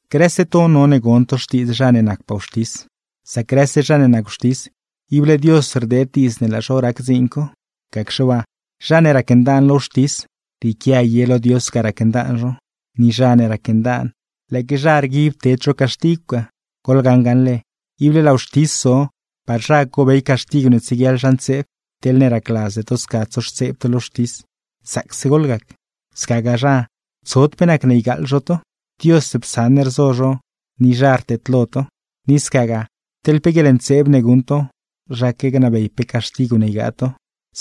Grëse to none gon to xtiidz zha ne nacpaa wxtis. Sac grëse zha ne nac wxtis, ible Dios rdeed diidz ne laa zho rac dziin co. Gacxe waa, zha ne racndaan lo wxtis, rrieequia ye lo Dios ga racndaan zho; ni zha ne racndaan, lëëque zha rguib ted zho caxtigw ga. Goḻgaṉ gaṉle, ible laa wxtis zo, par zha cobey caxtigw ne tsieguiaḻ zha ntseeb. Teḻne racladzde to sca tsoxtseeb to lo wxtis, zaacse goḻgac; scagaa zha, tsod pe nacne ygaaḻ zho to. Dios psaṉ rzo zho ni zha rteedlo to, ni scagaa, teḻne pe guieḻntseeb ne guṉ to, zhaque gnabey pe caxtigw ne ygaa to;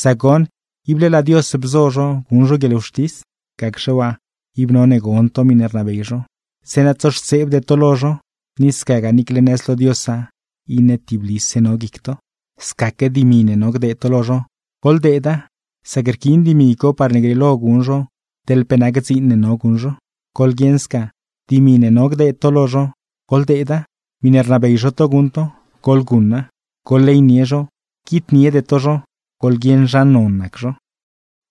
sac goṉ, ible laa Dios bzo zho guṉ zho guieḻwxtis. Gacxe waa, ib none gon to miṉe rnabey zho, zeeṉa tsoxtseebde to lo zho, ni scagaa niicle nëz lo Diosa iṉe tiblise no guic to. Scaque dimi ne no gdeed to lo zho, goḻdeeda; sac rquiin dimi co parne grieelo guṉ zho teḻ pe nac dziin ne no guṉ zho. Goḻguieṉ sca, dimi ne no gdeed to lo zho, goḻdeeda; miṉe rnabey zho to guṉ to, goḻguṉa. Goḻleynie zho, quitniede to zho, goḻguieṉ zha non nac zho.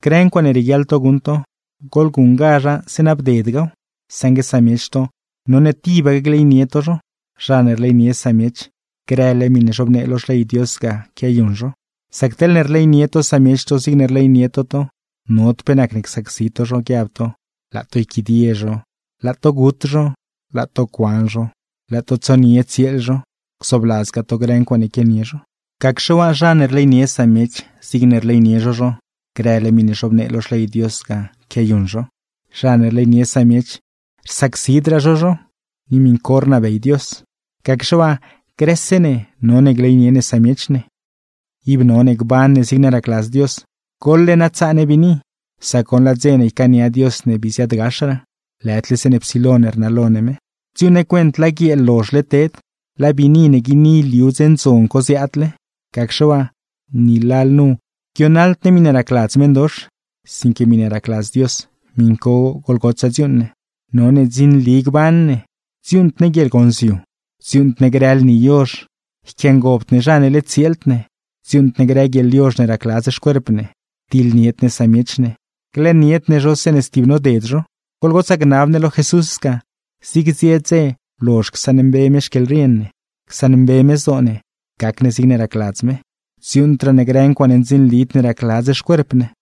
Grë ncuaaṉe rieguiaḻ to guṉ to, goḻguṉgazha zeeṉa bdedgaw; saṉgue samiech to, none tibaque gleynie to zho. Zha ne rleynie samiech, grële miṉe zhobnee lo Xley Dios ga quiayuṉ zho. Sac teḻne rleynie to samiech to zigne rleynie to to, nod pe nacne csacsi to zho; guiab to: laa to yquidie zho, laa to gut zho, laa to cuan zho, laa to tsonie tsieel zho, gzoobladzgaa to grë ncuaaṉe quianie zho. Gacxe waa, zha ne rleynie samiech zigne rleynie zho zho, grële miṉe zhobnee lo Xley Dios ga quiayuṉ zho. Zha ne rleynie samiech, rsacsidraa zho zho; ni miṉ co rnabey Dios. Gacxe waa, grëse ne none gleynie ne samiech ne. Ib none gban ne zigne racladz Dios, goḻle na tsaa ne biini; sac goṉ, laa dze ne ycaania Dios ne bii ziaadgaxraa, lëdle zeeṉe psilo rnalo ne me. Dziuuṉ ne cuent laa guieel lozhle ted, laa biini ne guini liu dze ndzon co ziaadle; gacxe waa, ni lalnu guionaḻd ne miṉe racladz meṉdox, sinque miṉe racladz Dios, miṉ co goḻgotsaa dziuuṉ ne. None ndzinli gban ne: dziuuṉd ne guieḻgonziu, dziuuṉd ne grë lni yozh, yquiangobd ne zha ne led tsieeld ne, dziuuṉd ne grë guieḻyozh ne racladz xcuerp ne, diḻnied ne samiech, glëënied ne zho zeeṉe stib noded zho. Goḻgotsaa gnab ne lo Jesús sca, zig zie dze lozh csaṉmbe me xquieḻrien ne, csaṉmbe me zdoo ne, gac ne zigne racladz me. Dziuuṉdraa ne grë ncuaaṉe ndzinlid ne racladz xcuerp ne.